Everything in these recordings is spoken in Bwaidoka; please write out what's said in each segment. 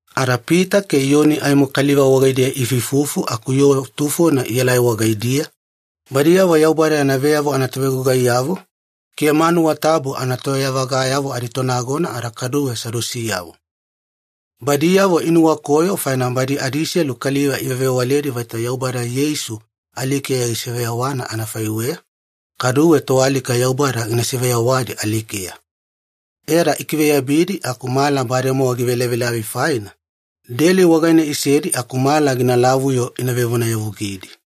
Ada Pita ke Iyoni aimo kaliva wagaidiya iifuifufu aku yoo tufona ielai wagaidiya, badiyavo Yaubada yana veyavo anatovegugaiyavo, ke manuwa tabu anatoyavagayavo aditonagona ada kaduwe Sadusiyavo. Badiyavo inuwakoyo faina badi adiselu kaliva ivewavewaledi vaita Yaubada Yeisu alikeya gisiveyawana anafaiweya, kaduwe toalika Yaubada gina siveyawadi alikeya. E ada ikiveyabidi aku mala bademowa givelavilavi faina, deli wagaine isedi aku mala ginalavu-yo ina vevonayavugidi.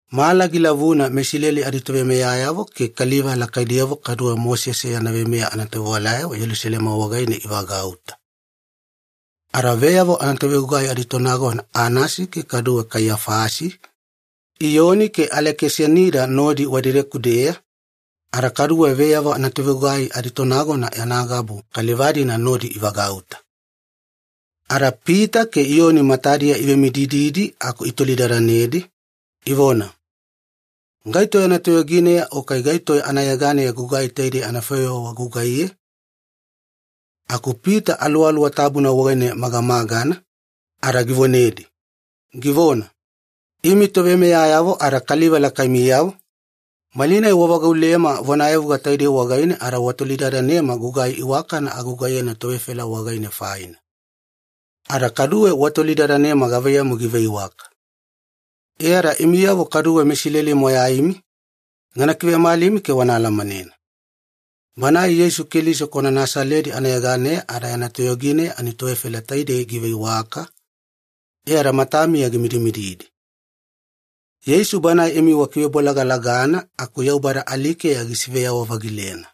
Mala gilavuna meIsileli aditoveimeyayavo ke kaliva lakaidiyavo kaduwe Mosese yana veimeya anatovewalayavo Yelusalema wagaine ivagauta. Ada veyavo anatovegugai aditonagona Anasi ke kaduwe Kaiyafasi, Iyoni ke Alekisanida nodi wadedeku-deya, ada kaduwe veyavo anatovegugai aditonagona yana gabu kaliva-dina nodi ivagauta. Ada Pita ke Iyoni matadiya ivemidididi aku itolidadanedi, ivona, “Gaito yana toyogineya o kai gaito anayeganeya gugai taidei anafaiweya wagugaiye?” Aku Pita Aluwaluwa Tabuna wagaine magamagana, ada givonedi, givona, “Imi toveimeyayavo ada kaliva lakaimiyavo, malinai wavagaulema vonayavuga taidei wagaine ada watolidadanema gugai iwakana agugaiyena tovefela wagaine faina. Ada kaduwe watolidadanema gavaiyamu giveiwaka. E ada imiyavo kaduwe meIsileli moyaimi, gana kivemalimi ke wana alamanena. Banae Yeisu Keliso kwana Nasaledi anayeganeya ada yana toyogineya ani tovefela taidei giveiwaka, e ada matamiya gimidimididi. Yeisu Banae imi wakivebolagalagana aku Yaubada alikeya gisiveyawa-vagilena.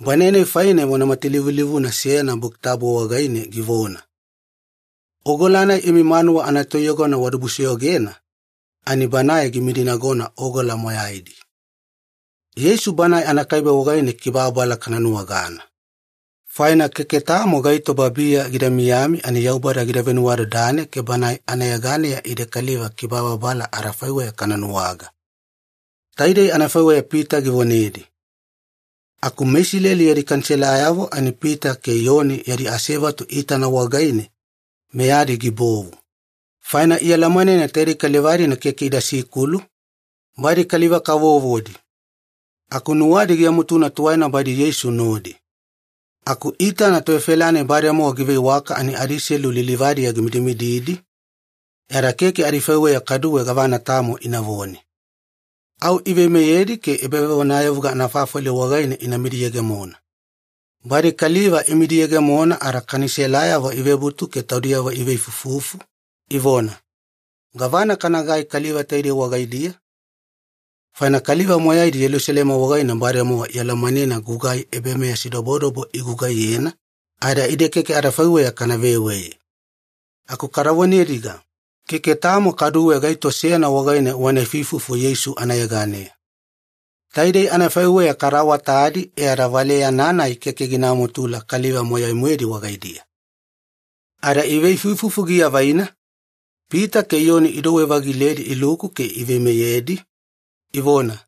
Banae-nai faine vona matalivulivuna seyana Buki Tabu wagaine givona, ‘Ogola-nai imi manuwa anatoiyogona wadibusoyogena, ani Banae gimidinagona ogola moyaidi.’ Yeisu Banae anakaibe wagaine kibababala kana nuwagana. Faina keke tamo gaito babiya gida miyami ani Yaubada gida venuwadadane ke banae anayeganeya ide kaliva kibababala adafaiweya kana nuwaga.” Taidei anafaiweya Pita givonedi. Aku meIsileli yadi Kaniselayavo ani Pita ke Iyoni yadi asevatu iitana wagaine, meyadi gibovu. Faina ialamanena taidei kaliva-dina keke ida sikulu, badi kaliva-kavovodi. Aku nuwadi giamutuna tuwaina badi Yeisu nodi. Aku iitana tovefela-nai bademowa giveiwaka ani adiselu lilivadiya gimidimididi, e ada keke adifaiweya kaduwe gavana tamo inavone. Au iveimeyedi ke ebavevonayavuga anafafali wagaine ina midiyegemona. Badi kaliva imidiyegemona ada Kaniselayavo ivebutu ke taudiyavo iveifuifufu, ivona, “Gavana kanagai kaliva taidei wagaidiya? Faina kaliva moyaidi Yelusalema wagaine bademowa ialamanena gugai ebameyasidobodobo igugaiyena, ada ide keke adafaiweya kana veweye. Aku kada vonediga, ‘Keke tamo kaduwe gaito seyana wagaine wana ifuifufu Yeisu anayeganeya.’ Taidei anafaiweya kada awatadi e ada valeyana-nai keke gina mutula kaliva moyai-moedi wagaidiya.” Ada iveifuifufu giavaina, Pita ke Iyoni idouwe-vagiledi iluku ke iveimeyedi, ivona,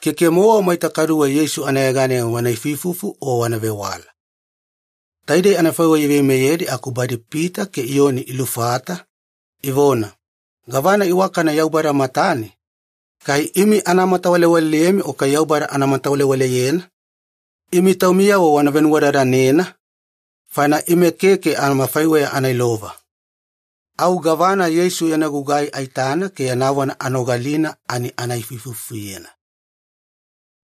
“Keke-mowa maita kaduwe Yeisu anayeganeya wana ifuifufu o wana vewala.” Taidei anafaiweya iveimeyedi aku badi Pita ke Iyoni ilufata, ivona, “Gavana iwakana Yaubada matane, kai imi ana matawalewaleyemi o kai Yaubada ana matawalewaleyena? Imi taumiyavo wana venuwadadanena, faina ime keke amafaiweya ana ilova. Au gavana Yeisu yana gugai aitana ke yana vona anogalina ani ana ifuifufuyena.”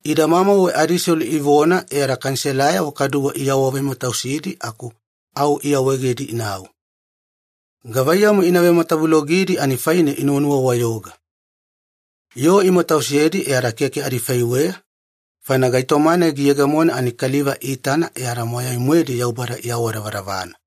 Idamamauwe adiselu ivona e ada Kaniselayavo kaduwe iawavematausidi aku au iawaegedi inau. Gavaiyamu ina vematavulogidi ani faine inuwanuwa-wayoga. Yoo imatausedi e ada keke adifaiweya, faina gaitoma-nai giyegemona ani kaliva iitana e ada moyai-moedi Yaubada iawadavadavana.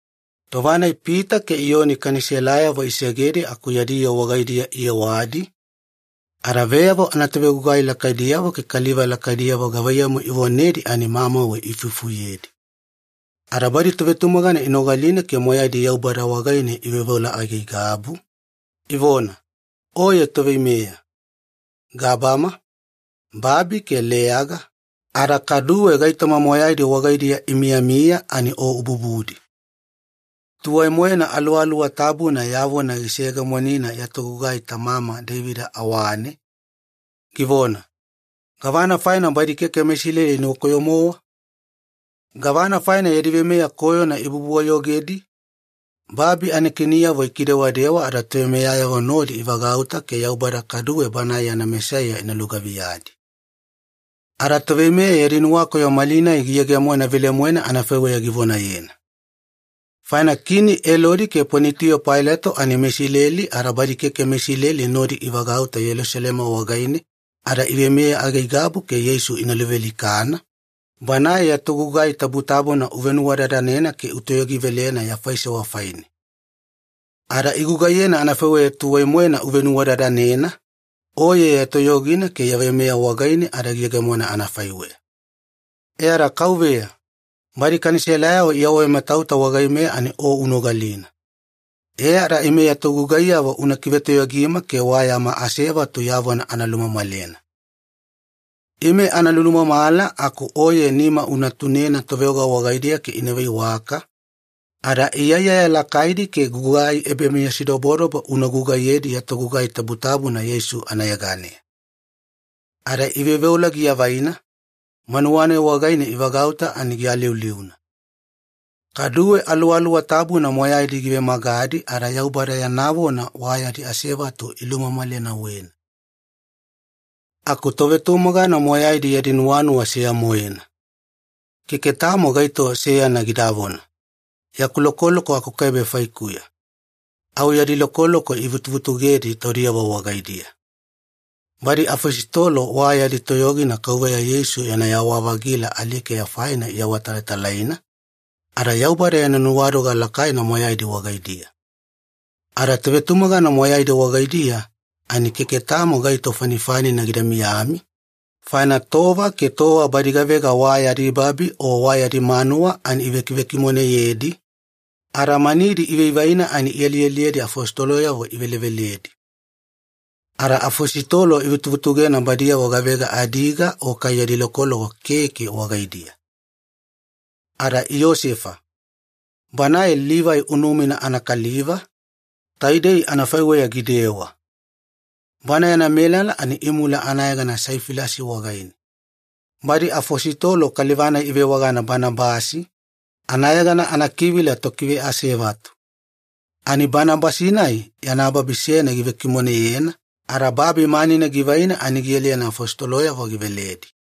Tova-nai Pita ke Iyoni Kaniselayavo isegedi aku yadi yoo wagaidiya iyewadi, ada veyavo anatovegugai lakaidiyavo ke kaliva lakaidiyavo gavaiyamu ivonedi ani mamauwe iifufuyedi. Ada badi tovetumagana inogalina ke moyaidi Yaubada wagaine iveoveola aigaigabu, ivona, “Oye Toveimeya. Gabama, babi, ke leyaga, ada kaduwe gaitoma moyaidi wagaidiya imiyamiya ani O ububudi. Tuwai-moena Aluwaluwa Tabuna ya vona giseyegemonina ya togugai tamama Deivida awane, givona, ‘Gavana faina badi keke meIsileli inuwakoyo-mowa? Gavana faina yadi veimeya koyona ibubu-wayogedi? Babi anakiniyavo ikidewadewa ada toveimeyayavo nodi ivagauta ke Yaubada ada Banae yana Mesaiya ina lugaviyadi.’ Ada toveimeya yadi nuwakoyo malinai giyegemona velemoena anafaiweya givonayena. Faina Kini Elodi ke Ponitiyo Pailato ani meIsileli ada badi keke meIsileli nodi ivagauta Yelusalema wagaine ada iveimeya aigaigabu ke Yeisu ina luvealikana, Banae ya togugai tabutabuna uvenuwadadanena ke utoyogivelena ya faisewa faine. Ada igugaiyena anafaiweya tuwai-moena uvenuwadadanena, Oye ya toyogina ke ya veimeya wagaine ada giyegemona anafaiweya. E ada Kauveya, badi Kaniselayavo iawavematauta wagaimeya ani O unogalina. E ada ime ya togugaiyavo una kivetoyogima ke wa yama asevatu ya vona ana lumamalena. Ime ana lulumamala aku Oye nima una tunena toveoga wagaidiya ke ina veiwaka, ada iyaiyaya lakaidi ke gugai ebameyasidobodobo una gugaiyedi ya togugai tabutabuna Yeisu anayeganeya.” Ada iveoveola giavaina, manuwa-nai wagaine ivagauta ani gialiuliuna. Kaduwe Aluwaluwa Tabuna moyaidi givemagadi ada Yaubada yana vona wa yadi asevatu ilumamalenauwena. Aku tovetumagana moyaidi yadi nuwanuwa seya-moena. Keke tamo gaito seyana gidavona, “Yaku lokoloko akukaibe faikuya.” Au yadi lokoloko ivutuvutugedi taudiyavo wagaidiya. Badi afositolo wa yadi toyogina Kauveya Yeisu yana yawa-vagila alikeya faina iawatalatalaina, ada Yaubada yana nuwadoga lakaina moyaidi wagaidiya. Ada tovetumagana moyaidi wagaidiya ani keke tamo gaito fanifanina gida miyami, faina tova ke tova badi gavega wa yadi babi o wa yadi manuwa ani ivekivekimoneyedi, ada manidi ivaivaina ani ialialiyedi afositoloyavo iveleveledi. Ada afositolo ivutuvutugena badiyavo gavega adiga o kai yadi lokoloko keke wagaidiya. Ada Iyosefa, banae Livai unumina anakaliva, taidei anafaiweya gidewa. Bana yana melala ani imula anayegana Saifilasi wagaine. Badi afositolo kaliva-nai ivewagana Banabasi, anayegana anakivila ‘tokiveasevatu’. Ani Banabasi-nai yana babi seyana givekimoneyena, ada babi manina givaina ani gialiyena afositoloyavo giveledi.